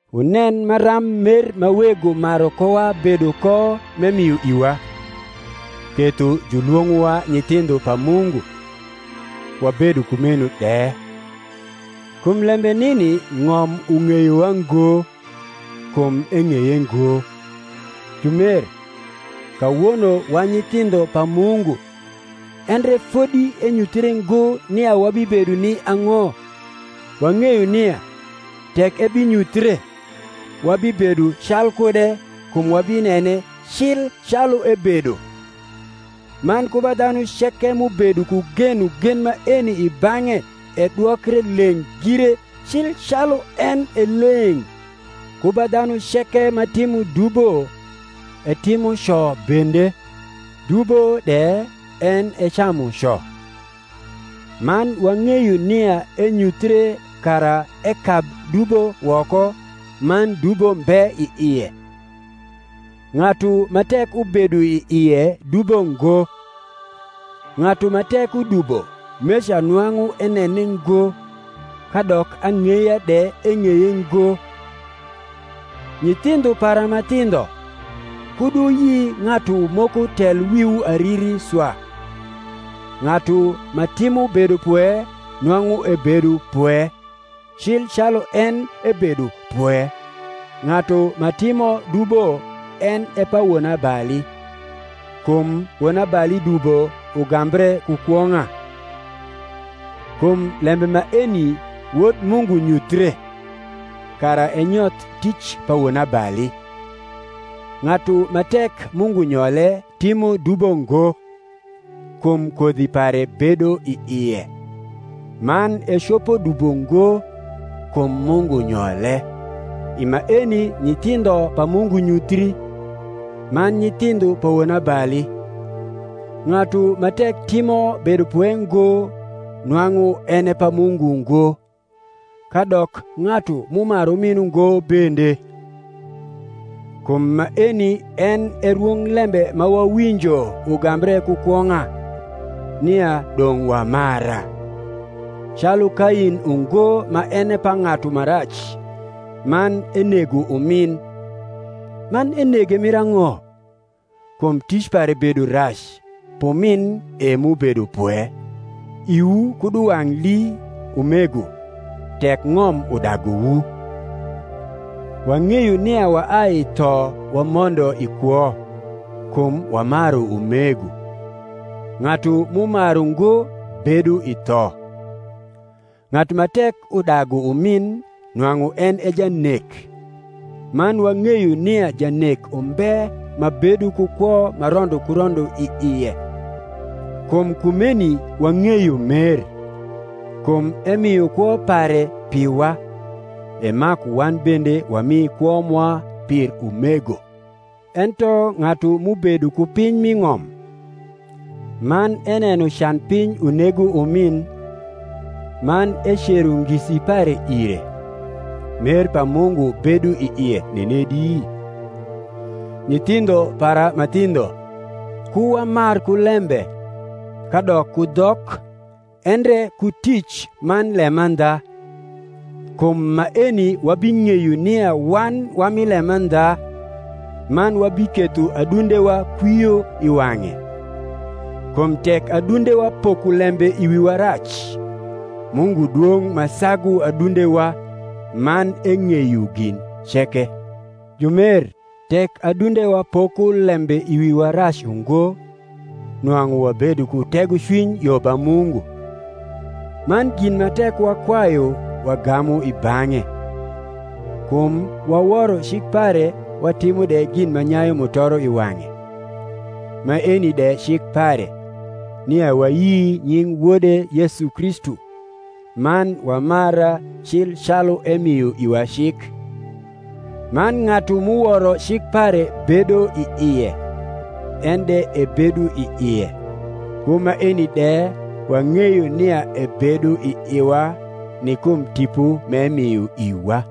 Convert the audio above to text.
Wunen maram mer ma Wego maru kowa bedo ko m’emio iwa, ketho julwong’owa nyithindho pa Mungu; wabedo kumeno de. Kum lembe nini ng’om ung’eyowa ngo, kum eng’eye ngo. Jumer, kawono wa nyithindho pa Mungu, endre fodi enyuthre ngo nia wabibedo ni ang’o. Wang’eyo nia, tek ebinyuthie, wabibedo calkude; kum wabinene cli calu ebedo. Man ku ba dhanu ceke m’ubedo ku genogen maeni i bang’e edwokre leng’ gire, cil calu en e leng’. Ku ba dhanu ceke ma timo dubo etimo co bende; dubo de en e camuco. Man wang’eyo nia enyuthre kara ekab dubo woko; man dubo mbe i ie. Ng’atu ma tek ubedo i ie dubo ngo: ng’atu ma tek udubo meca nwang’u enene ngo, kadok ang’eya de eng’eye ngo. Nyithindho para ma thindho, kud wuyi ng’atu moko tel wiwu ariri swa; ng’atu ma timo bedopwe nwang’u ebedo pwe, cil calu en ebedo pwe: ng’atu ma timo dubo en e pa wonabali; kum wonabali dubo ugambre ku kwong’a. Kum lembe maeni Wod Mungu nyuthie, kara enyoth tic pa wonabali. Ng’atu ma tek Mungu nyole timo dubo ngo, kum kodhi pare bedo i ie: man ecopo dubo ngo, kum Mungu nyole. I maeni nyithindho pa Mungu nyuthii, man nyithindho pa wonabali: ng’atu ma tek timo bedopwe ngo nwang’u en e pa Mungu ngo, kadok ng’atu m’umaru umin ungo bende. Kum maeni en e rwonglembe ma wawinjo ugambre ku kwong’a, nia dong’ wamara: calu Kain ungo ma en e pa ng’atu ma rac, man enego umin. Man enege mir ang’o? Kum tic pare bedo rac, p’umin e m’ubedo pwe. Iwu kud uwang’ lii, umego, tek ng’om udaguwu. Wang’eyo nia waai i tho wamondo i kwo, kum wamaru umego. Ng’atu m’umaru ngo bedo i tho. Ng’atu ma tek udagu umin nwang’u en e janek: man wang’eyo nia janek umbe ma bedo ku kwo ma rondo ku rondo i ie. Kum kumeni wang’eyo mer, kum emio kwo pare piwa: e maku wan bende wami kwo mwa pir umego. Ento ng’atu m’ubedo ku piny m’i ng’om. man eneno can piny unego umin. man ecero ngisi pare ue, mer pa Mungu bedo i ie nenedi? Nyithindho para ma thindho, ku wamar ku lembe, kadok ku dhok; endre ku tic man lemandha. Kum maeni wabing’eyo nia wan wa mi lemandha, man wabiketho adundewa kwio i wang’e: kum tek adundewa poko lembe i wiwa rac, Mungu dwong’ ma sagu adundewa, man eng’eyo gin ceke. Jumer, tek adundewa poko lembe i wiwa rac ungo, nwang’u wabedo ku tegocwiny yo ba Mungu; man gin ma tek wakwayu wagamu i bang’e, kum waworo cik pare watimo de gin ma nyayu mutoro i wang’e. Maeni de cik pare, nia wayi nying Wode Yesu Kristu, man wamara cil calu emio iwa cik. Man ng’atu m’uworo cik pare bedo i ie, en de ebedo i ie. Ku maeni de wang’eyo nia ebedo i iwa, ni kum Tipo m’emio iwa.